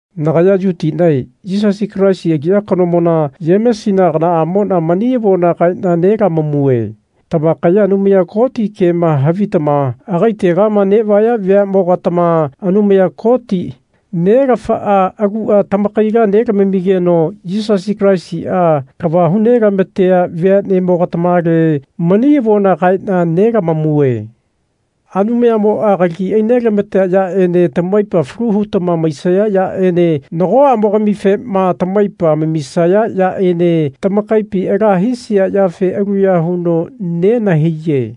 Nagaya Yutinae Yisasi Kalaisi aliya kanomona Yemesina aganaamona mani avona kaena nelamamue. Tamakaya Anumaya Koti kema havitama agaitegama nevaya veamogatama Anumaya Koti, Nelafaa agua tamakaila nelamamigeno Yisasi Kalaisia kava hu nelamatea veamogatamale mani avona kaena nelamamue. Anumayamoa kalagi ainelamatea yaene tamaipa falu hutama maisaya yaene nagoamogamifema tamaipa amamisaya yaene tamakaipi ala hisia yafe aluya huno nenahaiye.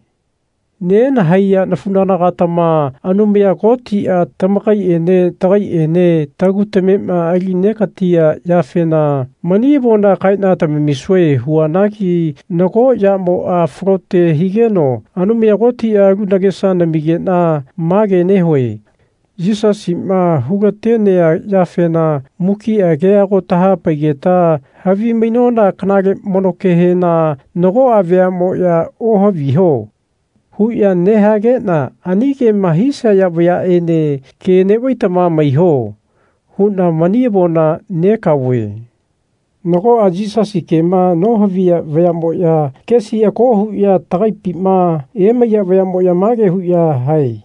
Nenahaiya nafunagana-gatama Anumaya Kotia tamakaiene tagaiene tagu tamema ali negatia yafena mani avona kaena tamamisue huanagi nago yamoa falote higeno Anumaya Kotia alu nagesa namigena mage nehue. Yisasima hu-latenea yafena mukia kea ago tahapaigeta havimainona kanale mono kehena nagoa veamoya Ohaviho. huya nehagena ani kema hisaya vayaene Ke nevaitama maiho. huna mani avona negaove. Nagoa Yisasi kema nohaviya vayamoya kesi ako huya tagaipima emaiya vayamoya mage huya hae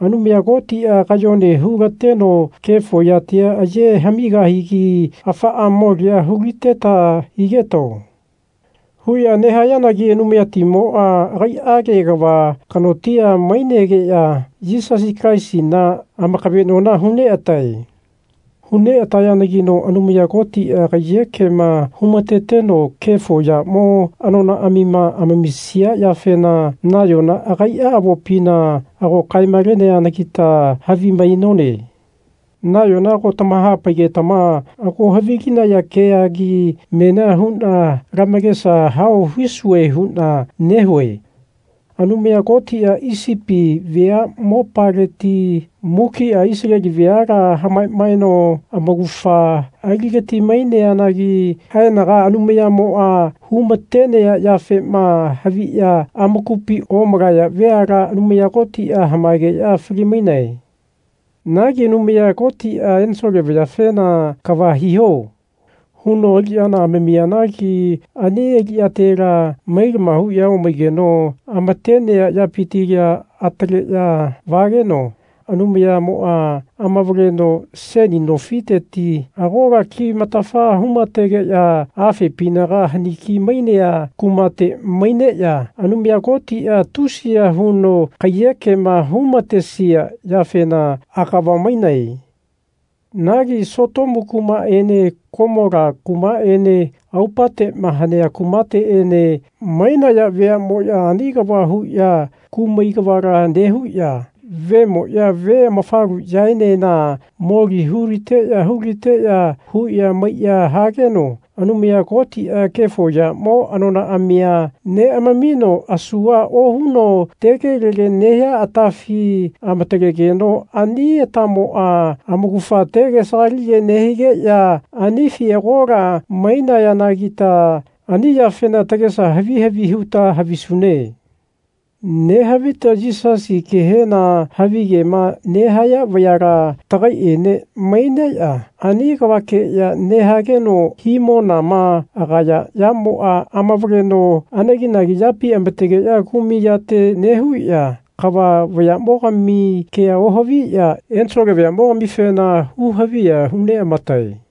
Anumaya Kotia kayone hu-lateno kefo yatia aye hamigahigi afaa molia hu-liteta higetao. huya nehayanagi Anumayatimoa agaiage kava kanotia mainegeya Yisasi Kalaisina amakavenona hu neatae. Hu neatayanagino Anumaya Kotia kaiyekema humateteno kefo yamo anonaamima amamisia yafena nayona agaia avopina ago kae-maleneanagita havimainone. Nayona ago tamahapaigetama ago havilinaya keagi menia huna lamakesa hao hisue huna nehue. Anumaya Kotia Isipi vea mopaleti mukia Isaleli veala hamamaeno amaugafa aligati-maineanagi haenaga Anumayamoa humatenea yafema haviya amakupi omalaya veala Anumaya Kotia hamaegeya fali-mainae. Nagi Anumaya Kotia ensole vayafena Kava hiho. huno aliyana amamianagi ani aliyatela mailama huya omaigeno amatenea yapitila ataleya vageno Anumayamoa amavaleno seni nofiteti agola kimatafa hu-mategeya afepinaga haniki-mainea kumate maineya Anumaya Kotia tusiya huno kaiyekema humatesia yafena agava mainae. Nagi Sotomu kumaene Komola kumaene aupatema hanea kumateene mainaya veamoya ani kava huya kumai kavala nehuya vemoya ve amafaluyaenena moli hu-liteya hu-liteya huya maiya hageno Anumaya Kotia kefo yamo anonaamia neamamino asua ohuno tegelege nehia atafi amatalegeno ani atamoa amaugafa tege sagalige nehigeya anifi agola mainayanagita ani yafena tagesa havi havi huta havisune. Nehavita Yisasi kehena havigema nehaya vayala tagaiene maineya ani kavakeya nehageno himonama agaya yamoa amavaleno anegi-nagi yapi amategeya kumai yate nehuya kava vayamogami kea ohaviya ensole vayamo-gamifena hu-haviya hu neamatae.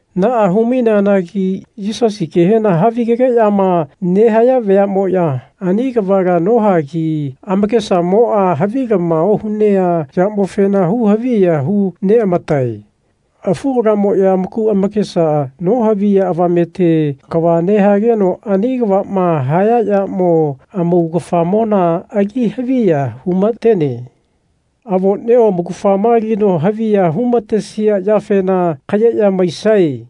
Naa hu-maineanagi Yisasi kehena havigegeyama nehaya vayamoya ani kavala nohagi amakesamoa havilama ohunea yamofena hu-haviya hu neamatae. Afu kalamoya amaku amakesa nohaviya avamete kava nehageno ani kavama haya yamo amaugafamona ali haviya hu-matene. Avonio amaugafama alino haviya humatesia yafena kayeya maisae.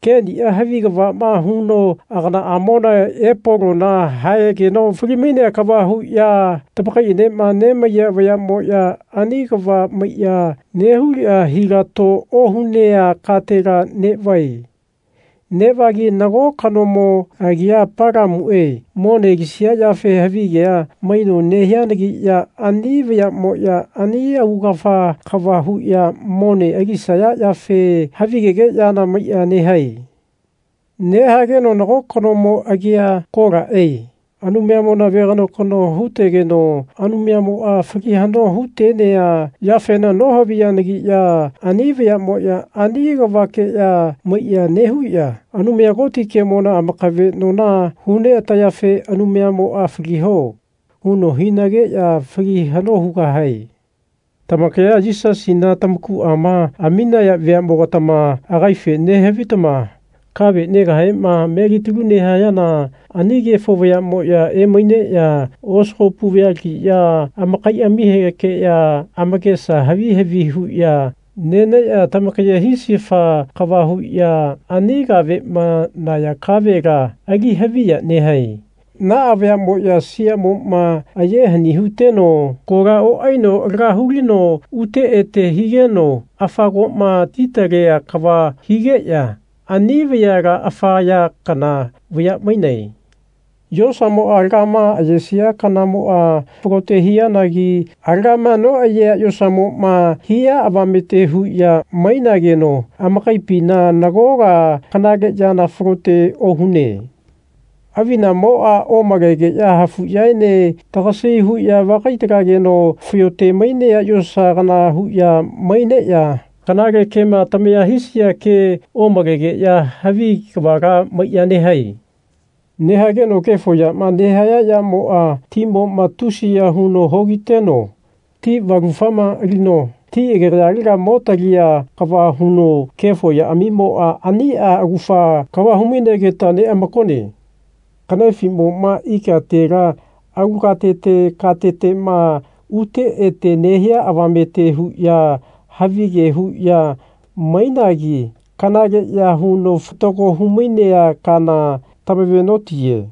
Kenia havi kavama huno aganaamona Epolona haegeno fali-mainea kava huya tamakaienema nemaiya vayamoya ani kava maiya nehuya hilato ohunea katela nevae. Nevagi nago kanomo agia Palamue mone alisia yafe havigea maino nehianagiya ani vayamoya ani augafa kava huya mone alisaya yafe havigegeyana maiya nehae. Nehageno nago kanomo agia Kolae Anumayamona veganokano hutegeno Anumayamoa fali hano hutenea yafena nohaviyanagiya ani vayamoya ani kavakeya maiya nehuya Anumaya Koti kemona amakavenona hu neatayafe Anumayamoa Faliho. huno hinageya fali hano hugahae. Tamakaya Yisasina tamakuama aminaya veamogatama agaife nehavitama kave negahema melitalu nehayana ani kefo vayamoya emaineya osagopu vayalagiya amakaiamihekeya amakesa havi havi huya neneya tamakaye hisifa kava huya ani kavema naya kavela ali haviya nehae. Naa vayamoya siamoma aye hani huteno kola oaino laga hulino ute ete higeno afa koma titalea kava higeya ani vayala afa ya kana vaya mainae. Yosamoa alagama ayesia kanamoa falote hianagi alagama noayea yosamoma hia avamete huya mainageno amakaipina nagola kanale yana falote ohune. Avinamoa omalegeya hafuyaene tagasi huya vakai-talageno fayote-mainea yosa kana huya maineya kanale kema tamaya hisaya kea omalegeya havi kavala maiya nehae. Nehageno kefo yama nehaya yamoa timoma tusiya huno hogiteno ti valufama alino ti agegayalega mo talia kava huno kefo yaamimoa ania augafa kava hu-mainegeta neamakone. Kanefimoma ikatela alu katete katetema ute ete nehia avamete huya havige huya mainagi kanaleya huno fatago humainea kana tamave-notiye.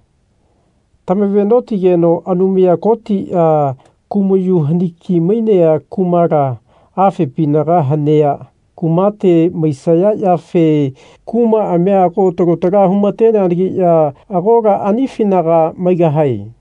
Tamave-notigeno Anumaya Kotia kumayu haniki-mainea kumala afepinaga hanea kumate maisaya yafe kumaamia ago talo tala humateneanagiya agola anifinaga maigahae.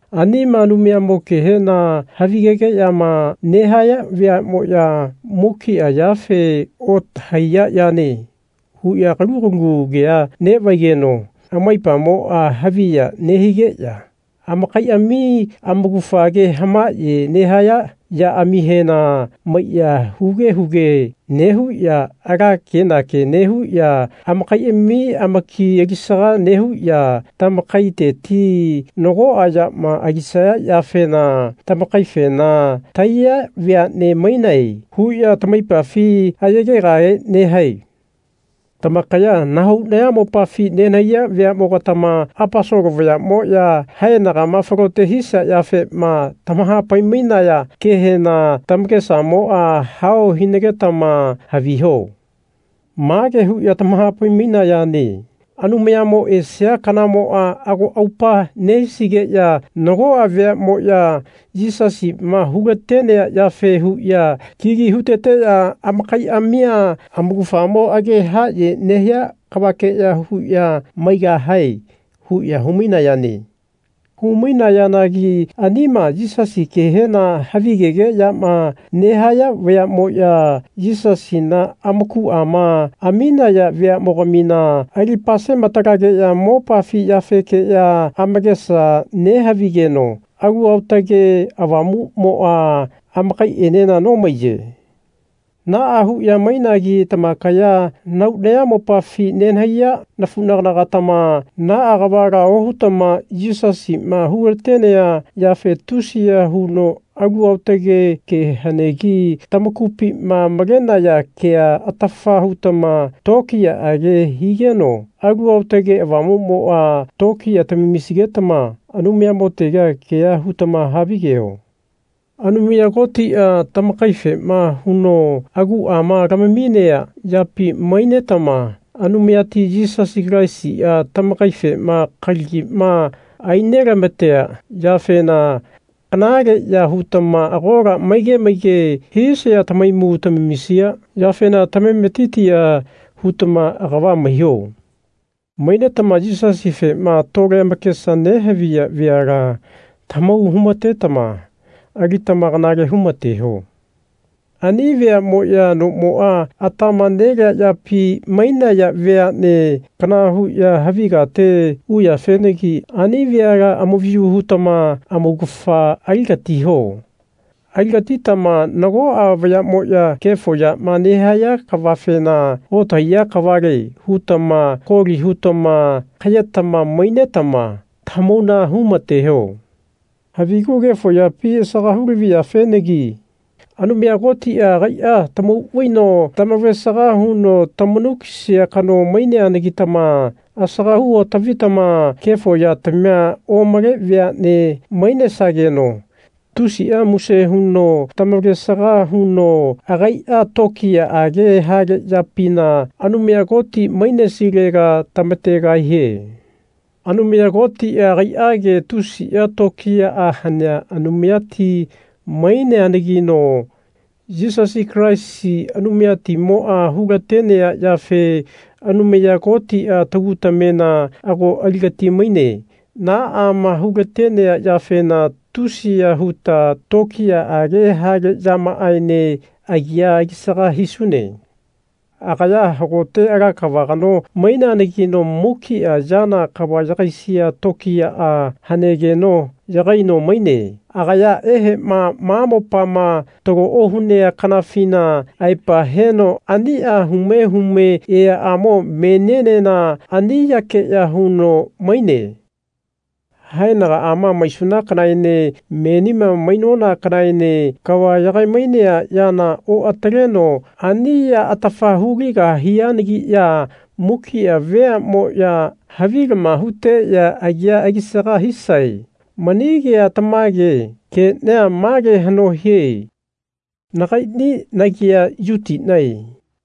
Anima Anumayamo kehena havigegeyama nehaya vayamoya mukia yafe Otahaiya yane. huya kalu kalu kea nevaigeno amaipamoa haviya nehigeya amakaiami amaugafa age hamaye nehaya yaamihena maiya huge huge nehuya ala kenake nehuya amakaiami amakia alisaga nehuya tamakaiteti nagoa yama alisaya yafena tamakaifena Tahaiya veane mainae. huya tamaipafi ayegegahe nehae. Tamakaya nahau nayamopafi nenahaiya veamogatama Aposolo vayamoya haenagama falote hisia yafema tamahapai-mainaya kehena tamakesamoa hao hinagetama haviho. Mage huya tamahapai-mainayane Anumayamo esia kanamoa ago aupa nehisigeya nagoa veamoya Yisasima hulatenea yafe huya kigi huteteya amakaiamia amaugafamo age haye nehia kavakeya huya maigahae. huya hu-mainayane. Hu-mainayanagi anima Yisasi kehena havigegeyama nehaya vayamoya Yisasina amakuama aminaya veamogamina ali-pasema-talageya mopafi yafekeya amakesa nehavigeno Alu Aotage Avamumoa amakaienena nomaiye. Naa huya mainagi tamakaya nahau nayamopafi nenahaiya nafunagana-gatama naa kavala ohutama Yisasima hulatenea yafe tusiya huno alu aotage ke hanegi tamakupima malenaya kea atafa hutama tokiyaage higeno Alu Aotage Avamumoa tokiya tamamisigetama Anumayamotega kea hutama havigeho. Anumaya Kotia tamakaifema huno aguama lamaminea yapi mainetama Anumayati Yisasi Kalaisia tamakaifema kalagima ainelamatea yafena kanaleya hutama agola maige maige hisaya tahaimu tamamisia yafena tamametitia hutama agava maiho. Mainetama Yisasifema tole amakesa nehaviya veala tamahau humatetama alitama kanale humateho. Ani veamoya nomoa atama nelea yapi mainaya veane kana huya havi kate uyafenagi ani veala amavayu hutama amaugafa aligatiho. Aligatitama nagoa vayamoya kefo yama nehaya kavafena Otahaiya kavale. hutama koli hutama kayetama mainetama tamahauna humateho. Havigu kefo yapi asaga hu-lavi yafenagi Anumaya Kotia agaia tamau vaino tamavalesaga huno tamanu kisia kano maineanagitama asaga hu otavitama kefo yatamia omale veane mainesageno tusia muse huno tamavalesaga huno agaia tokiyaage hale yapina Anumaya Koti mainesilega tamategahie. Anumaya Kotia agaiage tusia tokiyaa hanea Anumayati maineanagino Yisasi Kalaisi Anumayatimoa hulatenea yafe Anumaya Kotia tagu tamena ago aligati-maine. Naama hulatenea yafena tusiya huta tokiyaage hale yamaaene agia alisaga hisune. Agaya hagote ala kava kano maineanagino mukia yana kava yagaisia tokiyaa hanegeno yagaino maine. Agaya ehema ma mopama talo ohunea kanafina aepa heno ania hume hume eaamo menienena ani yakeya huno maine. Haenagaama maisuna kanaene menima mainona kanaene kava yagaimainea yana oataleno ani ya atafa hu-ligahianagiya mukia veamoya havilama huteya agia alisaga hisae. Mani kea tamage. Kenia male hano hie. Nagaini nagia Yutinae.